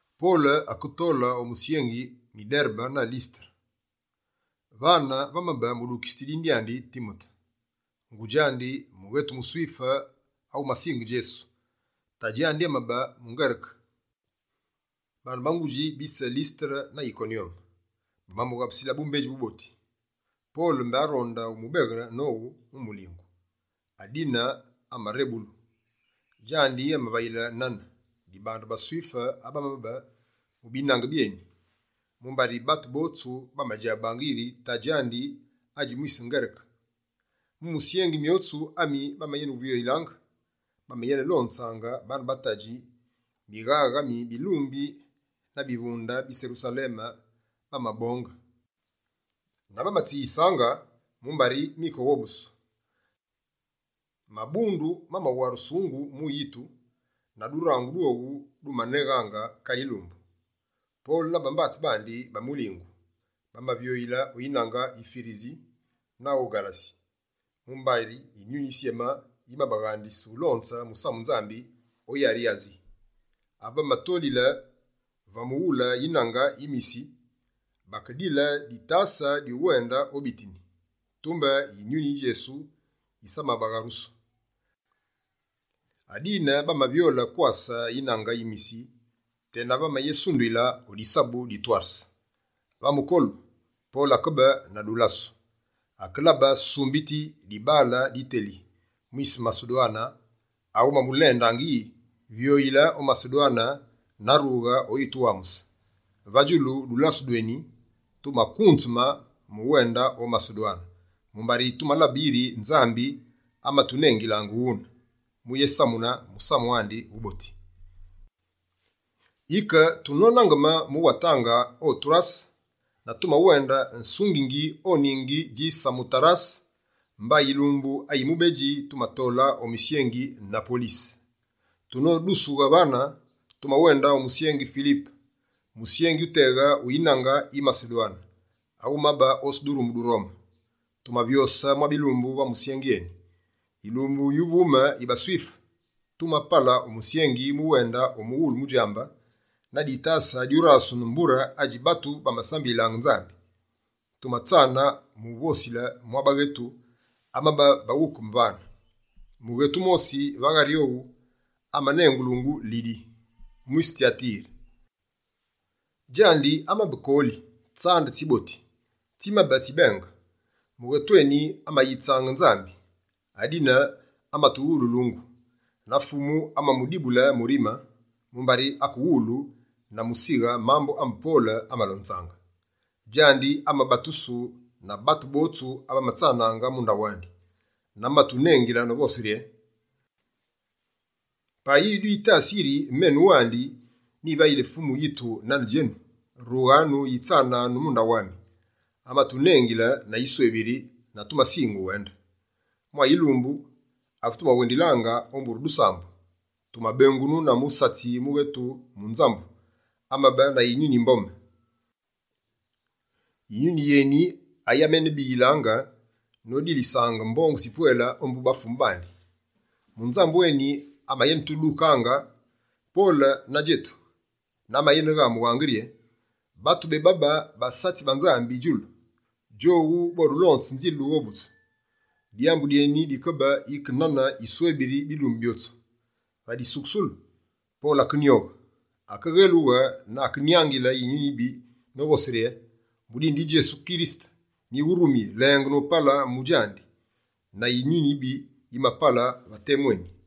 Pole aketole o misyengi mi Derebe na Lisetere. Vane vamabe mudukitsi dine dyandi Timote, ngudji andi mughetu muSwife awumasinge Djesu, tadji andi amabe muNgereke. Baane ba ngudji bise Lisetere na Yikonyome, bamamughabusilaange bumbedji buboti. Pole mbé aronde umubeghe nowu mu mulingu, adine amarebelu. Djandi amavayile nane, dibandu baSwife abamabe mu binange byeni, mumbari batu botsu bamadjabaange yiri tadji andi adji mwise Ngereke. Mu misyengi myotsu ami bamayenevyoyilaange, bamenelonzaange baane ba tadji mighaghe ami bilumbi na bivunde bi Serusaleme bamabonge, na bamatsiyisaange mumbari mikeghobusu. Mabundu mamawarusungu mu yitu, na durangu dwowu dumaneghaange kale yilumbu. Pole na bambatsi bandi ba mulingu, bamavyoyile o yinange yi Firisi na o Ghalasi, mumbari Yinyuni Yisyeme yimabaghandise ulonze musamu Nzambi o yari yi Asi. Ave bamatolile va mughule yinange yi Misi, bakedile ditase dyuwende o Bitini, tumbe Yinyuni yi Djesu yisamabagharusu. Adine bamavyole kwase yinange yi Misi tenave bamayesunduyile o disabu di Torwase. Va mukolu, Pole akebe na dulase. Akelabe sumbiti dibaale diteli, mwise Masedwane amamulendaange yi: «Vyoyile o Masedwane na rughe oyituwamuse!» Va djulu dulasu dweni, tumakunzeme mu uwende o Masedwane, mumbari tumalabe yiri Nzambi amatunengilaange wune, mu yésamune Musamu andi Wuboti. Yike, tunonangeme mu watange o Torwase, na tumawende sungingi o ningi dji Samotarase, mba yilumbu ayi mubedji, tumatole o musyengi Napolise. Tunodusughe vane, tumawende o musyengi Filipe, musyengi wuteghe wu yinange yi Masedwane, awumabe otsi durumu du Rome. Tumavyose mwa bilumbu va musyengi eni. Yilumbu yuvume yi baSwife, tumapale o musyengi mu wende o mughule mudjambe na ditase dyurasunu mbure adji batu bamasambililaange Nzambi. Tumatsane mu uvosile mwa baghetu, abamabe baghukeme vane. Mughetu wumosi va ghari owu amanengulungu Lidi, mwise Tyatire. Djandi amabe kooli tsande tsiboti tsimabe tsibenge. Mughetu eni amayitsaange Nzambi, adine amatuwululuungu. Na Fumu amamudibule murime, mumbari akewulu na musighe mambu ame Pole amalonzaange. Djandi amabatusu na batu botsu abamatsanaange mu ndaghu andi. Na amatunengile novose rye: «Payi dwitasi yiri menu wandi nyivayili Fumu yitu nane djenu, rughanu yitsananu mu ndaghu ami.» Amatunengile na yiswebiri na tumasinge uwende. Mwa yilumbu, ave tumawendilaange o mbure dusambu, tumabengunu na musatsi mughetu munzambu, amabe na yinyuni yi mbome. Yinyuni yeni ayi amayenebiyilaange, nodilisaange mbongu tsipwele ombu bafumu bandi. Munzambu eni amayenetudukaange, Pole na djetu, na amayeneghamughaange yiri: «Batu bebabe basatsi ba Nzambi djulu! Djowu bodulonze nzile dughobutsu!» Dyambu dyeni dikebe yike nane yiswebiri bilumbu byotsu. Va disukusulu, Pole akenyoghe, akeghelughe na akenyangile yinyuni yibi novose rye: «Mu dine di Djesu Kirisete, nyiwurumi lenge nopale mu djandi!» Na yinyuni yibi yimapale va temu eni.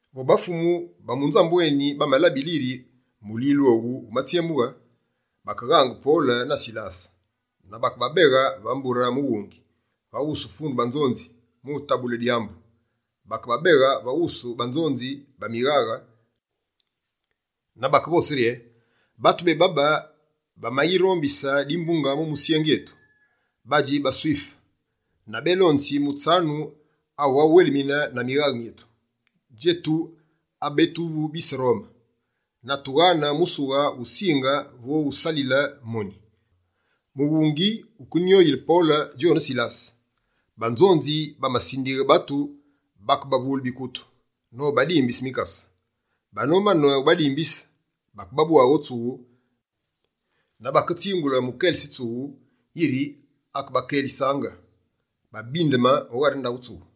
Vo bafumu ba munzambu eni bamalabile yiri mulilu owu wumatsyemughe, bakeghange Pole na Silase na bakebabeghe va mbure mughungi, va wusu fundu banzonzi mu utabule dyambu. Bakebabeghe va wusu banzonzi ba mighaghe na bakevose rye: «Batu bebabe bamayirombise dimbunge mu musyengi etu. Badji baSwife na bélonzi mutsanu awughawuwelimine na mighaghe myetu, djetu abe tuvu bise Rome. Na tughane musughe wusinge vo wusalise moni.» Mughungi wukenyoyile Pole djone Silase. Banzonzi bamasindighe batu bakebavule bikutu, nobadimbise mikase. Banomane wubadimbise, bakebabwaghe o tsughu na baketsingule mukelitsi tsughu, yiri akebakelisaange babindeme o ghari tsughu.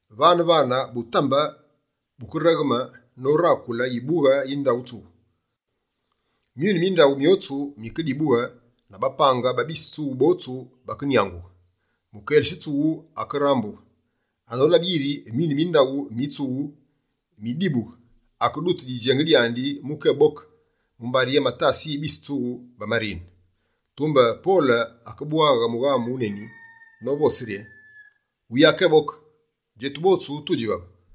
Vane-vane, butambe bukeregheme norakule yibughe yi ndaghu tsughu. Myune mi ndaghu myotsu mikedibughe na bapange ba bise tsughu botsu bakenyangughe. Mukelitsi tsughu akerambughe. Anolabe yiri myune mi ndaghu mi tsughu midibughe, akedute didjenge dyandi mukéboke, mumbari amatase yi bise tsughu bamarine. Tumbe Pole akebwaghe mughamu wuneni novose rye: «Wuyakéboke! Djetu botsu tudji vave!»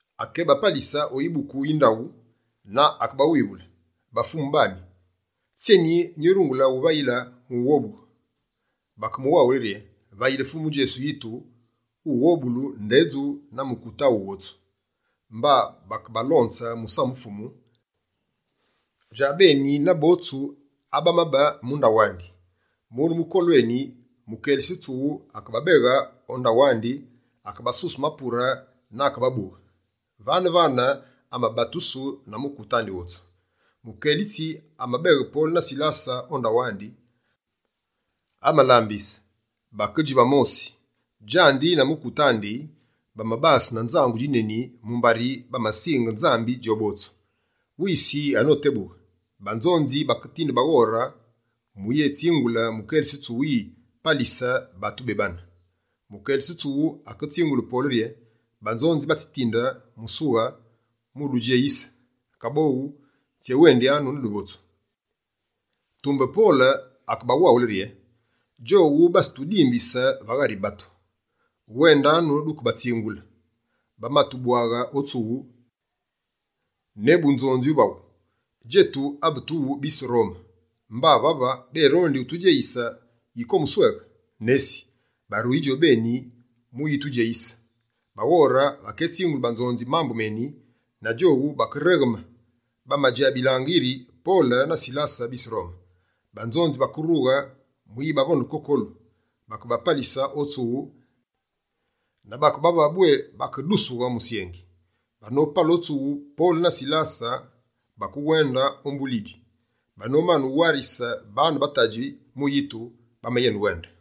Akebapalise o yibuku yi ndaghu na akebawivule: «Bafumu bami, tsyeni nyurungule uvayile mu ughobughe?» Bakemuwaghule yiri: «Vayile Fumu Djesu yitu, wughobulu, ndedju na mukute aghu wotsu.» Mba bakebalonze musamu Fumu, djabeni na botsu abamabe mu ndaghu andi. Mune mukolu eni, mukelitsi tsughu akebabeghe o ndawandi, akebasuse mapure na akebabughe. Vane-vane amabatusu, na mukute andi wotsu. Mukelitsi amabeghe Pole na Silase o ndaghu andi, amalambise, bakedji va mosi. Djandi na mukute andi, bamabase na nzangu djineni mumbari bamasinge Nzambi djobotsu. Wisi anotebughe, banzonzi baketinde baghore mu uyétsingule mukelitsi tsughu yi: «Palise batu bebane.» Mukelitsi tsughu aketsingule Pole rye: «Banzonzi batsitinde musughe wududjeyise. Kabo tsyewendyanu na duvotsu.» Tumbe Pole akebawaghule rye: «Djowu batsitudimbise va ghari batu. Wendanu dukebatsingule, bamatubwaghe o tsughu ne bunzonzi uvaghu. Djetu abe tuvu bise Rome! Mba vave, bérondi utudjeyise yike o musweghe? Nesi! Baruyi djobeni mu uyitudjeyise!» Baghore baketsingule banzonzi mambu meni, na djowu bakeregheme, badjabilaange yiri Pole na Silase bise Rome. Banzonzi bakerughe mu uyibavonde kokolu, bakebapalise o tsughu na bakebavaghe bwé bakedusughe musyengi. Banopale o tsughu, Pole na Silase bakewende ombu Lidi. Banomane uwarise baane ba tadji mu yitu, bamayenewende.